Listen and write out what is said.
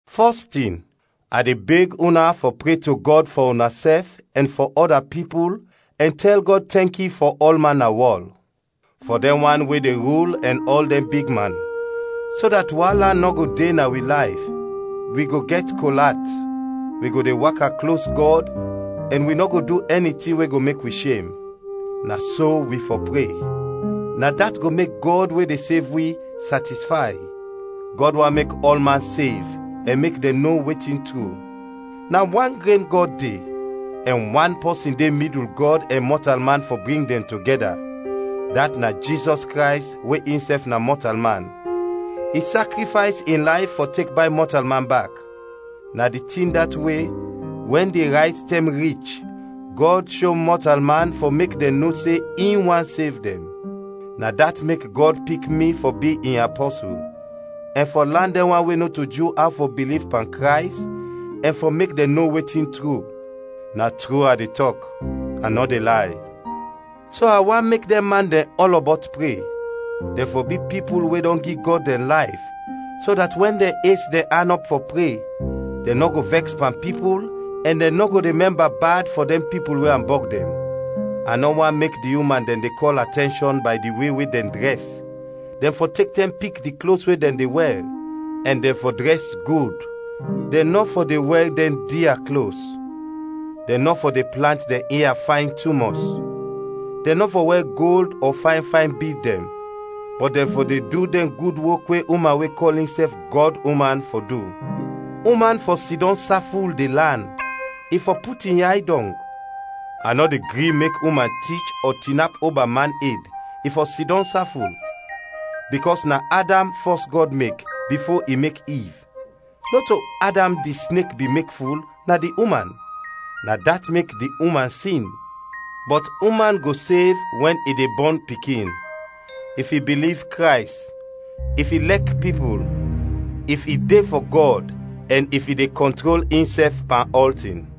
Fɔs tin, a de beg una fɔ pre to Gɔd fɔ unasɛf ɛn fɔ ɔda pipul ɛn tɛl Gɔd tɛnki fɔ ɔlman na wɔl; fɔ dɛn wan we de rul ɛn ɔl dɛn bigman, so dat waala nɔ go de na wi layf, wi go gɛt kol at, wi go de waka klos Gɔd ɛn wi nɔ go du ɛni tin we go mek wi shem. Na so wi fɔ pre; na dat go mek Gɔd we de sev wi, satisfay. Gɔd want mek ɔlman sev ɛn mek dɛn no wetin tru. Na wan gren Gɔd de, ɛn wan pɔsin de midul Gɔd ɛn mɔtalman fɔ bring dɛn togɛda, dat na Jizɔs Krays we insɛf na mɔtalman, i sakrifays in layf fɔ tek bay mɔtalman bak. Na di tin dat we, wɛn di rayt tɛm rich, Gɔd sho mɔtalman fɔ mek dɛn no se in want sev dɛn. Na dat mek Gɔd pik mi fɔ bi in apɔsul, ɛn fɔ lan dɛn wan we nɔto Ju aw fɔ biliv pan Krays ɛn fɔ mek dɛn no wetin tru. Na tru a de tɔk, a nɔ de lay. So a want mek dɛn man dɛn ɔlɔbɔt pre. Dɛn fɔ bi pipul we dɔn gi Gɔd dɛn layf, so dat wɛn dɛn es dɛn an ɔp fɔ pre, dɛn nɔ go vɛks pan pipul ɛn dɛn nɔ go de mɛmba bad fɔ dɛn pipul we ambɔg dɛn. A nɔ want mek di uman dɛn de kɔl atɛnshɔn bay di we we dɛn drɛs, dɛn fɔ tek tɛm pik di klos we dɛn de wɛr, ɛn dɛn fɔ drɛs gud, dɛn nɔ fɔ de wɛr dɛn dia klos; dɛn nɔ fɔ de plant dɛn ia fayn tumɔs; dɛn nɔ fɔ wɛr gold ɔ pal. Bɔt dɛn fɔ de du dɛn gud wok we uman we kɔl insɛf Gɔduman fɔ du. Uman fɔ sidɔm saful de lan, i fɔ put in yay dɔng. A nɔ de gri mek uman tich ɔ tinap oba man ed, i fɔ sidɔm saful. Bikɔs na Adam fɔs Gɔd mek, bifo i mek Iv; nɔto Adam di snek bin mek ful, na di uman; na dat mek di uman sin. Bɔt uman go sev wɛn i de bɔn pikin, if i biliv Krays, if i lɛk pipul, if i de fɔ Gɔd ɛn if i de kɔntrol insɛf pan ɔltin.